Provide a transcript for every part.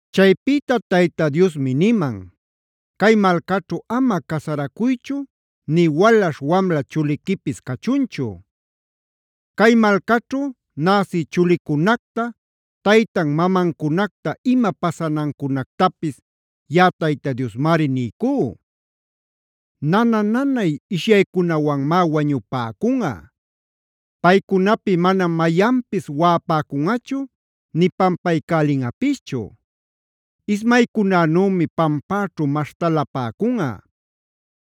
Chaypïta Tayta Diosmi niman: “Cay malcaćhu ama casaracuychu nï walaśh wamla chuliquipis cachunchu. Cay malcaćhu näsï chulicunacta, taytan mamancunacta ima pasanancunactapis yaꞌa Tayta Diosmari niycú. Nana-nanay ishyaycunawanmá wañupäcunꞌa. Paycunapi manam mayanpis waꞌapäcunꞌachu nï pampaycälinꞌapischu. Ismaycunänümi pampäćhu maśhtalapäcunꞌa.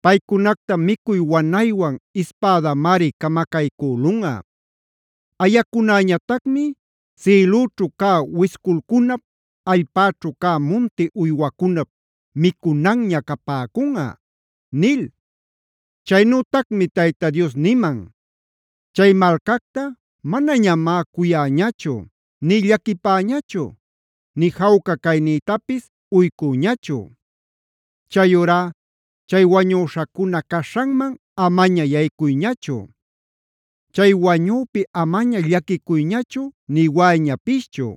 Paycunacta micuy wanaywan ispädamari camacaycülunꞌa. Ayacunäñatacmi sïlüćhu cä wisculcunap, allpäćhu cä munti uywacunap micunanña capäcunꞌa” nil. Chaynütacmi Tayta Dios niman: “Chay malcacta manañamá cuyäñachu nï llaquipäñachu nï jawca caynïtapis uycüñachu. Chayurá chay wañüśhacuna caśhanman amaña yaycuyñachu; chay wañüpi amaña llaquicuyñachu nï waꞌayñapischu.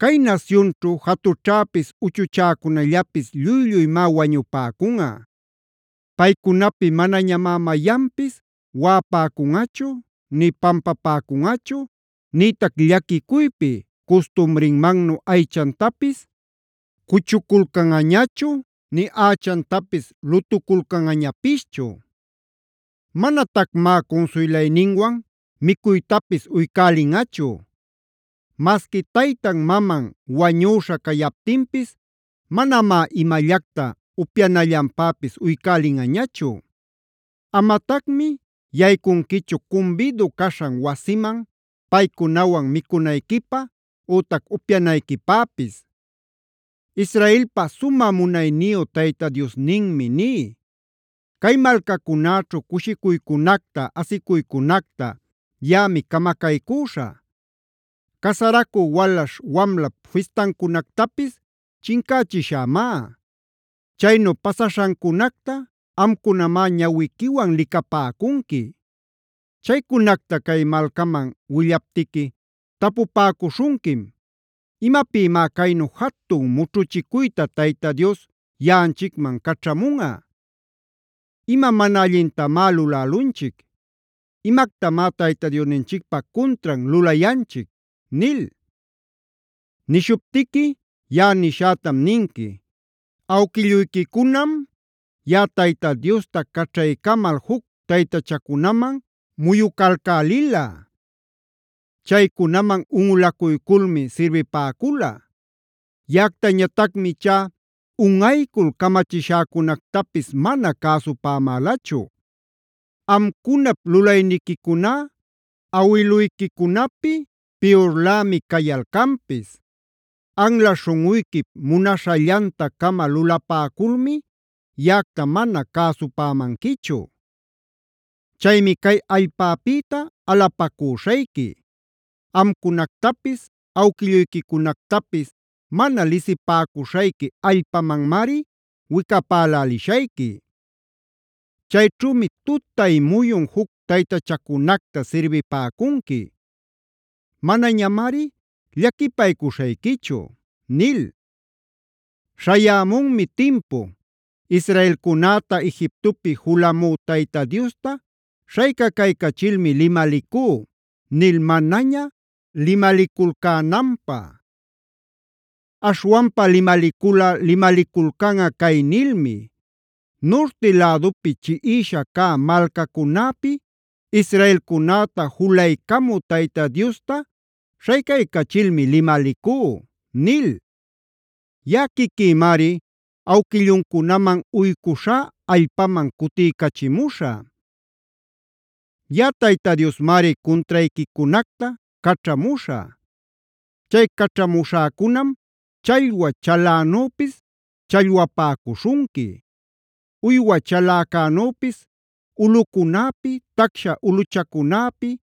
“Cay nasyunćhu jatućhäpis uchuchäcunallapis lluy-lluymá wañupäcunꞌa. Paycunapi manañamá mayanpis waꞌapäcunꞌachu nï pampapäcunꞌachu, nïtac llaquicuypi custumrinmannu aychantapis cuchuculcanꞌañachu nï ächantapis lutuculcanꞌañapischu. Manatacmá cunsuylayninwan micuytapis uycälinꞌachu. Masqui taytan-maman wañüśha cayaptinpis manamá imallacta upyanallanpäpis uycälinꞌañachu. Amatacmi yaycunquichu cumbidu caśhan wasiman paycunawan micunayquipä ütac upyanayquipäpis. Israelpa sumä munayniyu Tayta Diosninmi ní: Cay malcacunäćhu cushicuycunacta, asicuycunacta yaꞌami camacaycüśhä. Casaracü walaśh wamlap fistancunactapis chincächishämá.a Chaynu pasaśhancunacta amcunamá ñawiquiwan licapäcunqui. “Chaycunacta cay malcaman willaptiqui tapupäcuśhunquim: ‘¿Imapïmá caynu jatun mućhuchicuyta Tayta Dios yaꞌanchicman caćhamunꞌa? ¿Ima mana allintamá lulälunchic? ¿Imactamá Tayta Diosninchicpa cuntran lulayanchic?’ nil. Nishuptiqui yaꞌa nishätam ninqui: ‘Awquilluyquicunam, yaꞌa Tayta Diosta caćhaycamal juc taytachacunaman muyucalcälila; chaycunaman unꞌulacuyculmi sirbipäcula. Yaꞌactañatacmi ichá unꞌaycul camachishäcunactapis mana cäsupämälachu. Amcunap lulayniquicuná awiluyquicunapi piyurlämi cayalcanpis. Anla śhunꞌuyquip munaśhallanta-cama lulapäculmi yaꞌacta mana cäsupamanquichu. Chaymi cay allpapïta alapacüśhayqui; amcunanactapis, awquilluyquicunactapis mana lisipäcuśhayqui allpamanmari wicapälälishayqui. Chayćhümi tutay muyun juc taytachacunacta sirbipäcunqui. Manañamari llaquipaycuśhayquichu’ nil. “Śhayämunmi timpu: ‘Israelcunäta Egiptopi julamü Tayta Diosta śhaycaycachilmi limalicú’ nil manaña limaliculcänanpä. Aśhwanpa limaliculꞌa limaliculcanꞌa cay nilmi: ‘Nurti lädupi chiꞌisha cä malcacunäpi israelcunäta julaycamü Tayta Diosta śhaycaycachilmi limalicú’ nil.b Yaꞌa quiquïmari awquilluncunaman uycuśhá allpaman cutiycachimuśhä. “Yaꞌa Tayta Diosmari cuntrayquicunacta caćhamuśhä. Chay caćhamuśhäcunam challwa chalänüpis challwapäcuśhunqui; uywa chaläcänüpis ulꞌucunäpi, tacsha ulꞌuchacunäpi,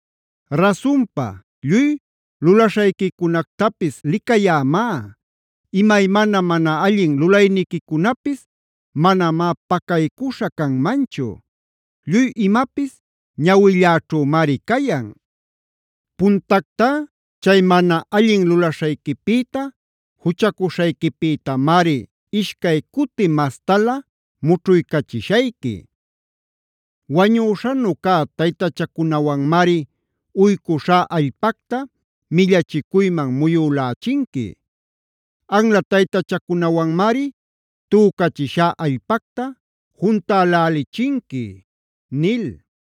Rasunpa, lluy lulaśhayquicunactapis licayämá; imaymana mana allin lulayniquicunapis manamá pacaycuśha canmanchu. Lluy imapis ñawilläćhümari cayan. Puntactá chay mana allin lulaśhayquipïta, juchacuśhayquipïtamari ishcay cuti mastalä mućhuycachishayqui. Wañüśhanu cä taytachacunawanmari uycuśhá allpacta millachicuyman muyülächinqui; anla taytachacunawanmari tücachishá allpacta juntälälichinqui” nil.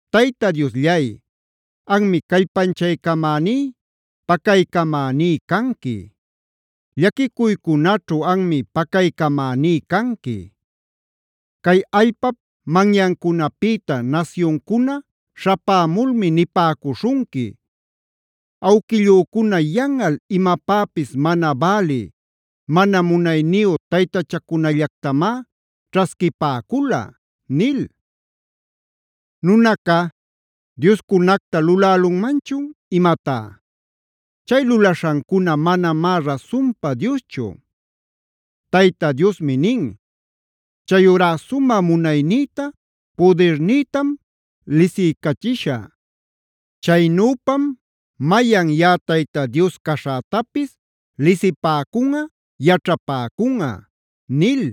Tayta Diosllay, anmi callpanchaycamäní, pacaycamäní canqui. Llaquicuycunaćhu anmi pacaycamäní canqui. Cay allpap manyancunapïta nasyuncuna śhapämulmi nipäcuśhunqui: “Awquillücuna yanꞌal imapäpis mana bälï, mana munayniyu taytachacunallactamá ćhasquipäcula” nil. ¿Nunaca dioscunacta lulälunmanchun imatá? Chay lulaśhancuna manamá rasunpa dioschu. Tayta Diosmi nin: “Chayurá sumä munaynïta, pudirnïtam lisiycachishä. Chaynüpam mayan yaꞌa Tayta Dios caśhätapis lisipäcunꞌa, yaćhapäcunꞌa” nil.